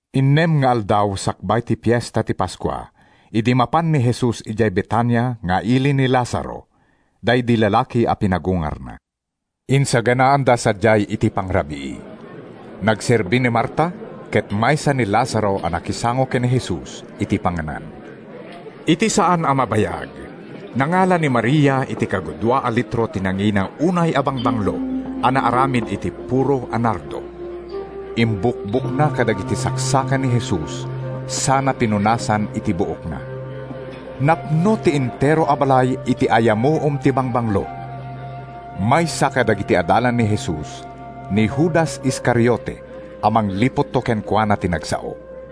Innem nga aldaw sakbay ti Fiesta ti Paskua idi mapan ni Jesus idiay Betania nga ili ni Lazaro, daydi lalaki a pinagungarna. Insaganaanda sadiay iti pangrabii. Nagserbi ni Marta ket maysa ni Lazaro a nakisango ken ni Jesus iti panganan. Iti saan a mabayag, nangala ni Maria iti kagudua a litro ti nangina unay a bangbanglo a naaramid iti puro a nardo. Imbukbokna kadagiti saksaka ni Jesus sana pinunasan iti buokna. Napno ti entero a balay iti ayamuom ti bangbanglo. Maysa kadagiti adalan ni Jesus, ni Judas Iscariote a mangliputto kenkuana ti nagsao.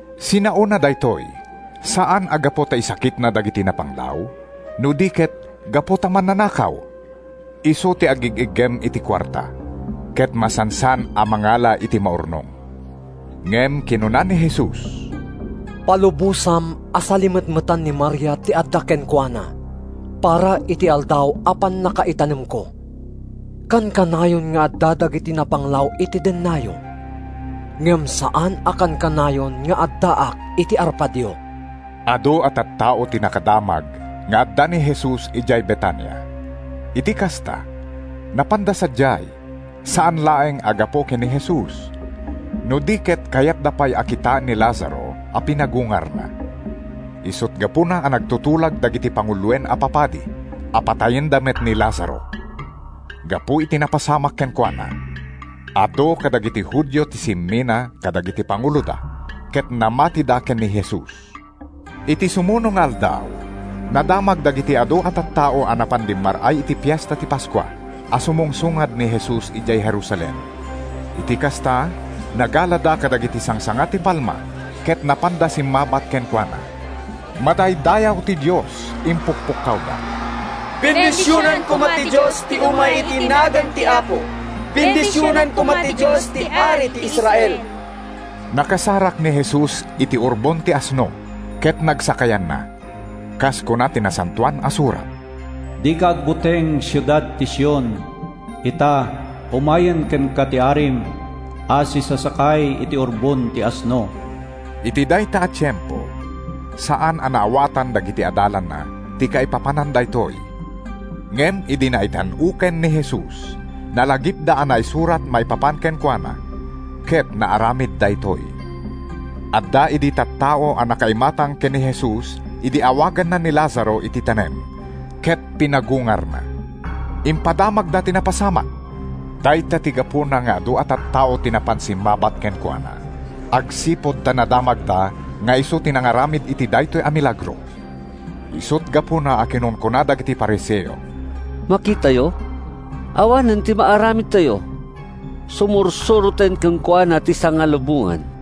Sinaona daytoy, saan a gapu ta isakitna dagiti napanglaw, no di ket gapu ta mannanakaw. Isu ti agig-iggem iti kuarta, ket masansan a mangala iti maurnong. Ngem kinuna ni Jesus, “Palubosam a salimetmetan ni Maria ti adda kenkuana para iti aldaw a pannakaitanemko. Kankanayon nga adda dagiti napanglaw iti dennayo, ngem saan a kankanayon nga addaak iti arpadyo.” Adu a tattao ti nakadamag nga adda ni Jesus idiay Betania. Iti kasta, napanda sadiay, saan laeng a gapu ken ni Jesus, no di ket kayatda pay a kitaen ni Lazaro a pinagungarna. Isut’ gapuna a nagtutulag dagiti panguloen a papadi a patayenda met ni Lazaro. Gapu iti napasamak kenkuana, adu kadagiti Judio ti simmina kadagiti panguloda ket namatida ken ni Jesus. Iti sumuno nga aldaw, nadamag dagiti adu a tattao a napan dimmar-ay iti Fiesta ti Paskua a sumungsungad ni Jesus idiay Jerusalem. Iti kasta, nagalada kadagiti sangsanga ti palma ket napanda simmabat kenkuana. “Madaydayaw ti Dios!” impukpukkawda. “Bendisionan koma ti Dios ti umay iti nagan ti Apo! Bendisionan koma ti Dios ti Ari ti Israel!” Nakasarak ni Jesus iti urbon ti asno ket nagsakayanna, kas kuna ti Nasantoan a Surat: “Dika agbuteng, siudad ti Sion! Ita, umayen kenka ti Arim, A sisasakay iti urbon ti asno.” Iti dayta a tiempo, saan a naawatan dagiti adalanna ti kaipapanan daytoy, ngem idi naitan-oken ni Jesus, nalagipda a naisurat maipapan kenkuana ket naaramid daytoy. Adda idi tattao a nakaimatang ken ni Jesus idi awaganna ni Lazaro iti tanem ket pinagungarna. Impadamagda ti napasamak. Dayta ti gapuna nga adu a tattao ti napan simmabat kenkuana, agsipud ta nadamagda nga isu ti nangaramid iti daytoy a milagro. Isut’ gapuna a kinunkuna dagiti Fariseo, “Makitayo, awanen ti maaramidtayo! Sumursuroten kenkuana ti sangalubongan!”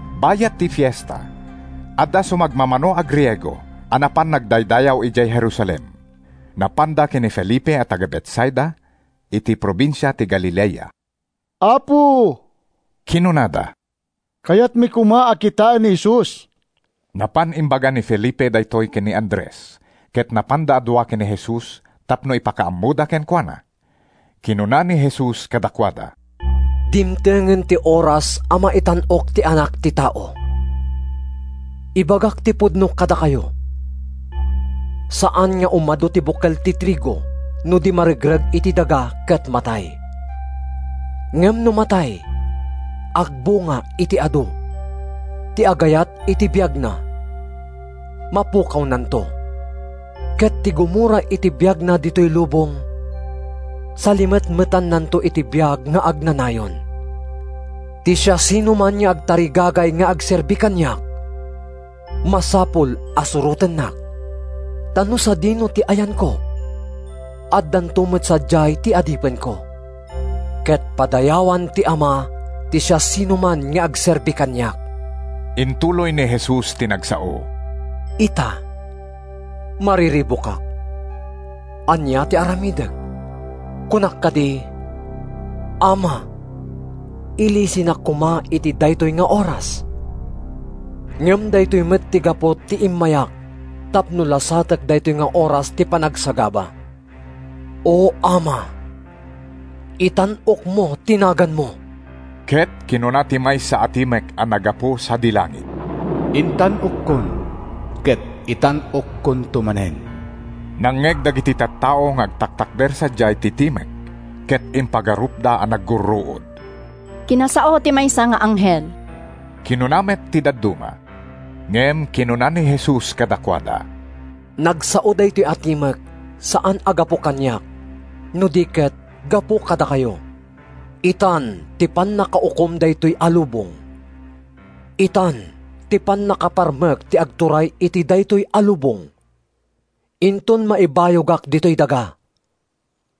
Bayat ti Fiesta, adda sumagmamano a Griego a napan nagdaydayaw idiay Jerusalem. Napanda ken ni Felipe a taga-Betsaida, iti probinsia ti Galilea. “Apo,” kinunada, “kayatmi koma a kitaen ni Jesus.” Napan imbaga ni Felipe daytoy ken ni Andres, ket napanda a dua ken ni Jesus tapno ipakaammoda kenkuana. Kinuna ni Jesus kadakuada, “Dimtengen ti oras a maitan-ok ti Anak ti Tao. Ibagak ti pudno kadakayo: Saan nga umadu ti bukel ti trigo no di maregreg iti daga ket matay. Ngem no matay, agbunga iti adu. Ti agayat iti biagna, mapukawnanto, ket ti gumura iti biagna ditoy lubong, salimetmetannanto iti biag nga agnanayon. Ti siasinoman nga agtarigagay nga agserbi kaniak, masapul a surotennak. Ta no sadino ti ayanko, addanto met sadiay ti adipenko. Ket padayawan ti Ama ti siasinoman nga agserbi kaniak.” Intuloy ni Jesus ti nagsao: “Ita, mariribukak. Ania ti aramidek? Kunak kadi, ‘Ama, ilisinak koma iti daytoy nga oras’? Ngem daytoy met ti gapu ti immayak tapno lasatek daytoy nga oras ti panagsagaba. O Ama, itan-okmo ti naganmo!” Ket kinuna ti maysa a timek a naggapu sadi langit, “Intan-okkon, ket itan-okkonto manen!” Nangngeg dagiti tattao nga agtaktakder sadiay ti timek ket impagarupda a naggurruod. “Kinasao ti maysa nga anghel!” kinuna met ti dadduma. Ngem kinuna ni Jesus kadakuada, “Nagsao daytoy a timek saan a gapu kaniak, no di ket gapu kadakayo. “Itan ti pannakaukom daytoy a lubong. Itan ti pannakaparmek ti agturay iti daytoy a lubong. Inton maibayogak ditoy daga,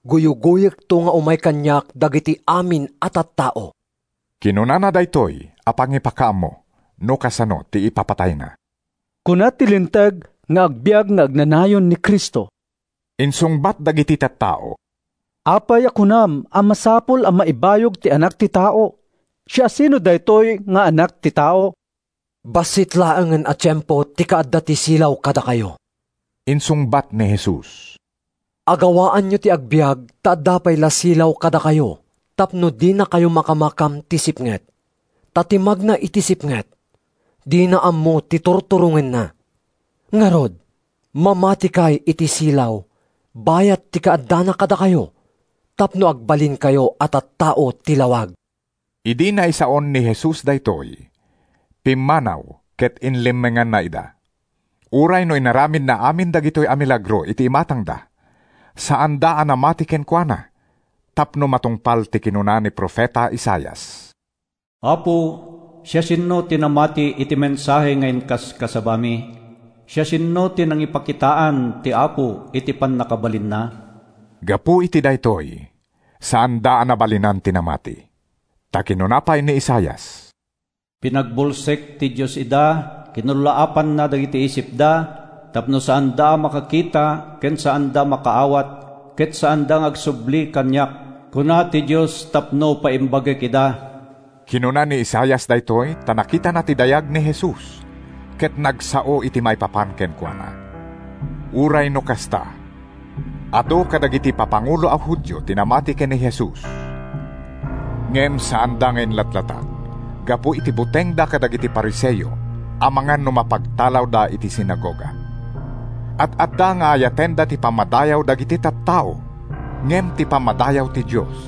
guyugoyekto nga umay kaniak dagiti amin a tattao.” ( Kinunana daytoy a pangipakaammo no kasano ti ipapatayna.) “Kuna ti Linteg nga agbiag nga agnanayon ti Cristo,” insungbat dagiti tattao. “Apay a kunam a masapul a maibayog ti Anak ti Tao? Siasino daytoy nga Anak ti Tao?” “Bassit laengen a tiempo ti kaadda ti silaw kadakayo,” insungbat ni Jesus. “Agawaanyo ti agbiag ta adda pay la ti silaw kadakayo tapno dinakayo makamakam ti sipnget. Ta ti magna iti sipnget, dina ammo ti turturongenna. Ngarud, mamatikay iti silaw bayat ti kaaddana kadakayo tapno agbalinkayo a tattao ti lawag.” Idi naisaon ni Jesus daytoy, pimmanaw ket inlemmenganna ida. Uray no inaramidna amin dagitoy a milagro iti imatangda, saanda a namati kenkuana tapno matungpal ti kinuna ni profeta Isaias: “Apo, siasino ti namati iti mensahe nga inkasabami? Siasino ti nangipakitaan ti Apo iti pannakabalinna?” Gapu iti daytoy, saanda a nabalinan ti namati. Ta kinuna pay ni Isaias: “Pinagbulsek ti Dios ida, kinullaapanna dagiti isipda, tapno saanda a makakita, ken saanda a makaawat, ket saanda nga agsubli kaniak, kuna ti Dios, tapno paimbagek ida.” Kinuna ni Isaias daytoy ta nakitana ti dayag ni Jesus, ket nagsao iti maipapan kenkuana. Uray no kasta, adu kadagiti papangulo a Judio ti namati ken ni Jesus. Ngem saanda nga inlatlatak gapu iti butengda kadagiti Fariseo amangan no mapagtalawda iti sinagoga. Ad-adda nga ayatenda ti pammadayaw dagiti tattao ngem ti pammadayaw ti Dios.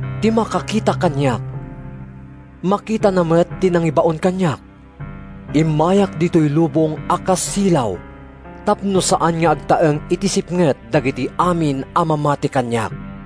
Ti makakita kaniak, makitana met ti nangibaon kaniak. Immayak ditoy lubong a kas silaw tapno saan nga agtaeng iti sipnget dagiti amin a mamati kaniak.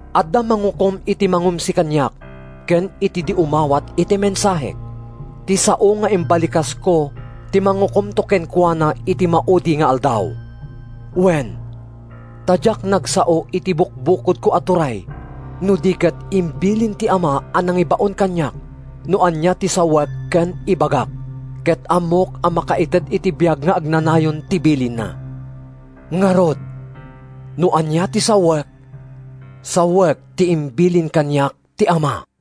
Adda mangukom iti mangumsi kaniak ken iti di umawat iti mensahek. Ti sao nga imbalikasko ti mangukomto kenkuana iti maudi nga aldaw! Wen, ta diak nagsao iti bukbukodko a turay no di ket imbilin ti Ama a nangibaon kaniak no ania ti sawek ken ibagak. Ket ammok a makaited iti biag nga agnanayon ti bilinna. Ngarud, no ania ti sawek, sawek ti imbilin kaniak ti Ama.”